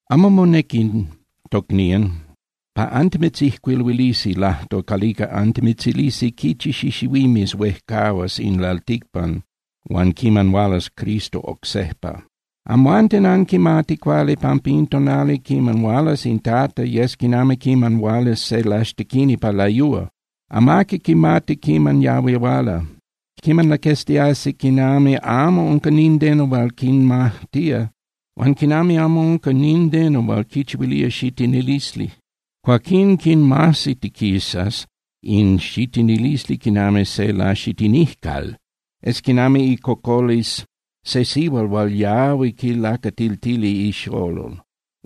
Amo monequi, tocnían, pa antimitzijcuiluilisi lajtol calica antimitzilisi quichi xixihuimes huejcahuas in lalticpan huan quiman hualas Cristo oc sejpa. Amhuanten anquimati cuali pampa in tonali quiman hualas in Tata yes quinami quiman hualas se laxtequini pa layúa. Amaqui quimati quiman yahui huala. Quiman laqueztiasi quinami amo unca nindeno hual quinmajtía, huan quinami amo unca nindeno hual quichihuilía xitinilisli, cuaquín quinmajsitiquisas in xitinilisli quinami se laxitinijcal. Yes quinami icocolisli se sihual hual yahui quilacatiltía ixolol.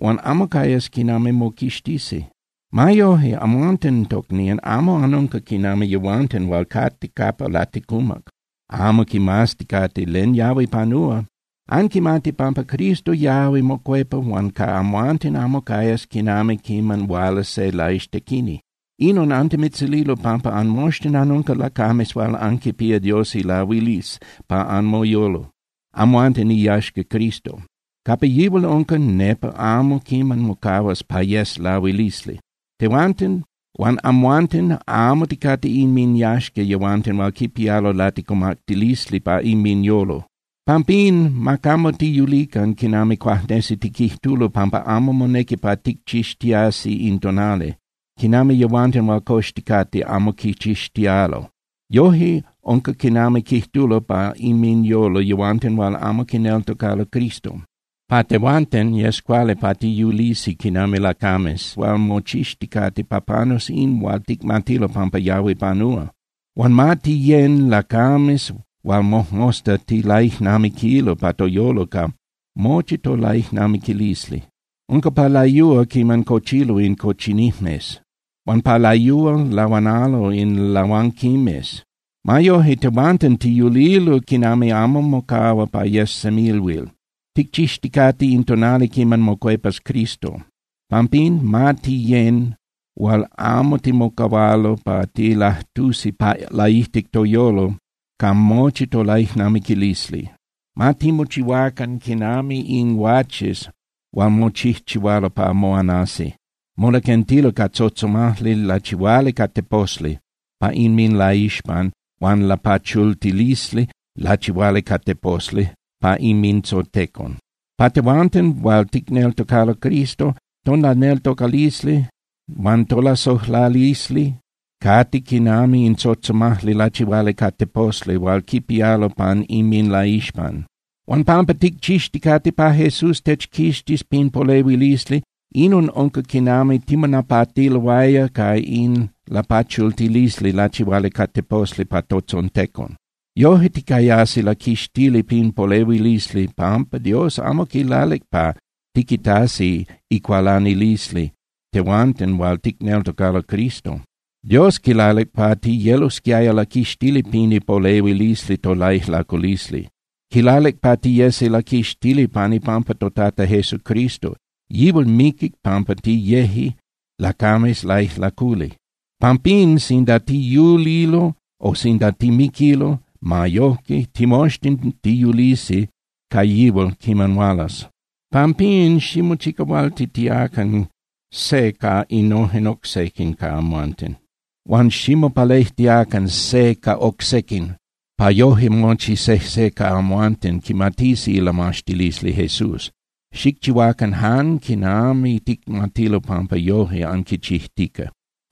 Huan amo cayas quinami moquixtisi. Ma yoje, amhuanten, tocnían, amo anunca quinami yehuanten hual cate capa laticumac amo quimazticate len yahui panúa. Anquimati pampa Cristo yahui mocuepa huan ca amhuanten amo cayas quinami quiman huala se laxtequini. Inon antimitzililo pampa anmoxtin anunca lacames hual anquipía Dios ilahuilisli pa anmoyolo, amhuanten iyaxca Cristo. Capa yihual unca, nepa amo quiman mocahuas pa yes lahuilisli. Tehuanten huan amhuanten amo ticate inminyaxca yehuanten hual quipialo laticumactilisli pa inminyolo. Pampín, ma camo tiyulican quinami cuajnesi tiquijtulo pampa amo monequi pa ticchixtiasi in tonali, quinami yehuanten hual coxticate amo quichixtialo. Yoje unca quinami quijtulo pa inminyolo yehuanten hual amo quineltocalo Cristo. Pa tehuanten, yes cuali pa tiyulisi quinami lacames hual mochixticate pa panus in hual ticmatilo pampa yahui panúa. Huan ma tiyén (tiyecan) lacames hual mojmosta tilaijnamiquilo pa toyolo ca mochi tolaijnamiquilisli. Unca pa layúa quiman cochilo in cochinijmes, huan pa layúa lahuanalo in lahuanquimes. Ma yoje, tehuanten tiyulilo quinami amo mocahua pa yes semilhuil. Ticchixticate in tonali quiman mocuepas Cristo. Pampín, ma tiyén (tiyecan) hual amo timocahualo pa tilajtusi pa laijtic toyolo ca mochi tolaijnamiquilisli. Ma timochihuacan quinami in guaches hual mochijchihualo pa moanasi. Molaquentilo ca tzotzomajli lachihuali ca teposli pa inminlaixpan huan lapachultilisli lachihuali ca teposli pa inmintzontecon. Pa tehuanten hual ticneltocalo Cristo, tolaneltocalisli huan tolasojlalisli cate quinami in tzotzomajli lachihuali ca teposli hual quipialo pan inminlaixpan. Huan pampa ticchixticate pa Jesús techquixtis pin polehuilisli, inon unca quinami timonapatiloaya ca in lapachultilisli lachihuali ca teposli pan totzontecon. Yoje ticayasi laquixtili pin polehuilisli pampa Dios amo quilalic pa tiquitasi icualanilisli tehuanten hual ticneltocalo Cristo. Dios quilalic pa tiyelosquiaya laquixtili pin ipolehuilisli tolaijlaculisli. Quilalic pa tiyesi laquixtili pan ipampa toTata Jesucristo. Yihual miquic pampa tiyeje lacames laijlaculi. Pampín sinda tiyulilo o sinda timiquilo, ma yojque timoxtin tiyulisi ca yihual quiman hualas. Pampín, ximochicahualtitiacan se ca innojen oc sequin ca amhuanten, huan ximopalejtiacan se ca oc sequin pa yoje mochi sejse ca amhuanten quimatisi ilamaxtilisli Jesús. Xicchihuacan jan quinami ticmatilo pampa yoje anquichijtica.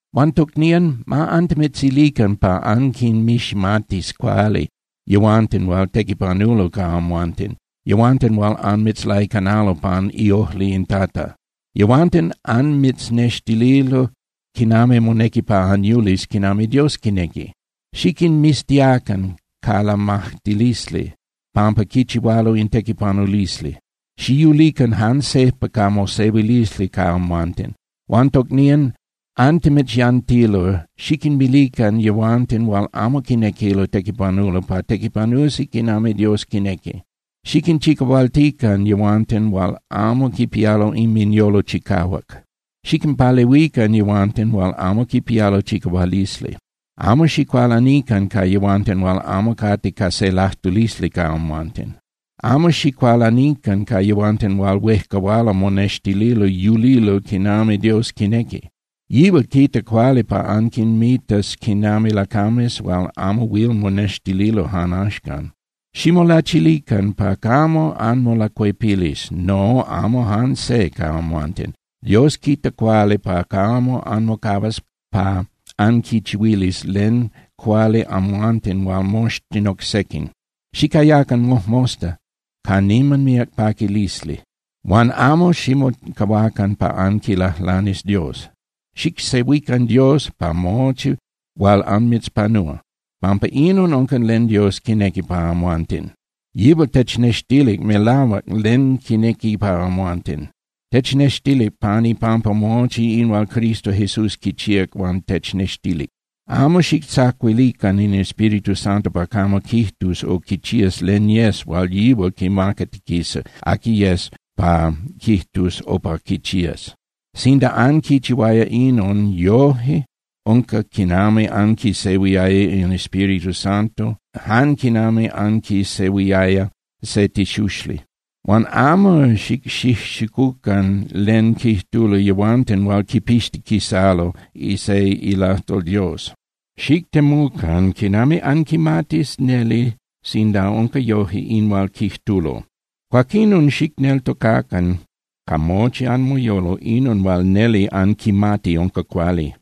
Huan tocnían, ma antimitzilican pa anquinmiximatis cuali yehuanten hual tequipanulo ca amhuanten, yehuanten hual anmitzlaicanalo pan iojli in Tata. Yehuanten anmitznextililo quinami monequi pa anyulis quinami Dios quinequi. Xiquinmiztiacan ca lamajtilisli pampa quichihualo in tequipanulisli. Xiyulican jan sejpa ca mosehuilisli ca amhuanten. Huan tocnían, antimitzyantilo, xiquinmilican yehuanten hual amo quinequilo tequipanulo pa tequipanusi quinami Dios quinequi. Xiquinchicahualtican yehuanten hual amo quipialo inminyolo chicahuac. Xiquinpalehuican yehuanten hual amo quipialo chicahualisli. Amo xicualanican ca yehuanten hual amo cate ca se lajtulisli ca amhuanten. Amo xicualanican ca yehuanten hual huejcahualo monextililo yulilo quinami Dios quinequi. Yihual quita cuali pa anquinmitas quinami lacames hual amo huil monextililo jan axcan. Ximolachilican pa camo anmolacuepilis, no, amo jan se ca amhuanten. Dios quita cuali pa camo anmocahuas pa anquichihuilis len cuali amhuanten huan moxtin oc sequin. Xicayacan mojmosta ca niman míac paquilisli. Huan amo ximocahuacan pa anquilajlanis Dios. Xicsehuican Dios pa mochi hual anmitzpanúa, pampa inon unca len Dios quinequi pa amhuanten. Yihual technextilic melahuac len quinequi pa amhuanten. Technextilic pan ipampa mochi in hual Cristo Jesús quichíac huan technextilic. Amo xictzacuilican in Espíritu Santo pa camo quijtus o quichías len yes hual yihual quimacatiquisa aqui yes pa quijtus o pa quichías. Sinda anquichihuaya inon, yoje unca quinami anquisehuiaya in Espíritu Santo jan quinami anquisehuiaya se tixuxli. Huan amo xicxijxicucan len quijtulo yehuanten hual quipixtiquisalo se ilajtol Dios. Xictemucan quinami anquimatis neli sinda unca yoje in hual quijtulo. Cuaquinon xicneltocacan ca mochi anmoyolo inon hual neli anquimati unca cuali.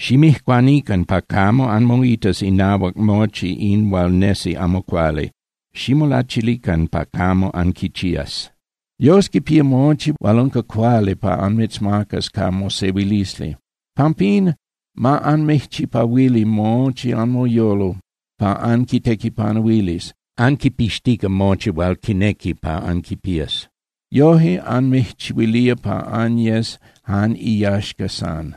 Ximijcuanican pa camo anmoitas inahuac mochi in hual nesi amo cuali, ximolachilican pa camo anquichías. Dios quipía mochi hual unca cuali pa anmitzmacas ca mosehuilisli. Pampín, ma anmijchipahuili mochi anmoyolo pa anquitequipanuilis, anquipixtica mochi hual quinequi pa anquipías. Yoje anmijchihuilía pa anyes jan iyaxca san.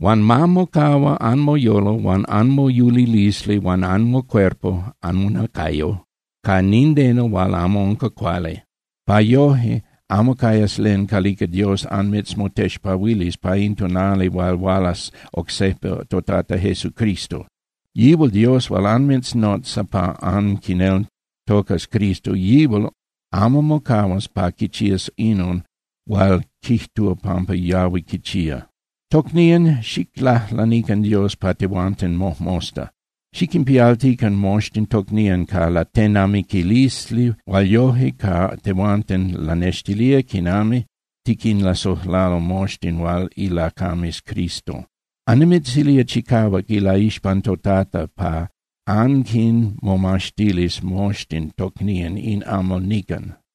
Huan ma mocahua anmoyolo huan anmoyulilisli huan anmocuerpo (anmonacayo) ca nindeno hual amo unca cuali, pa yoje amo cayas len calica Dios anmitzmotexpahuilis pa in tonali hual hualas oc sejpa toTata Jesucristo. Yihual Dios hual anmitznotza pa anquineltocas Cristo, yihual amo mocahuas pa quichías inon hual quijtúa pampa yahui quichía. Tocnían, xiclajlanican Dios pa tehuanten mojmosta. Xiquinpialtican moxtin tocnían ca latenamiquilisli hual yoje ca tehuanten lanextilía quinami tiquinlasojlalo moxtin hual ilacames Cristo. Annimitzilía chicahuac ilaixpan toTata pa anquinmomaxtilis moxtin tocnían in amal nican.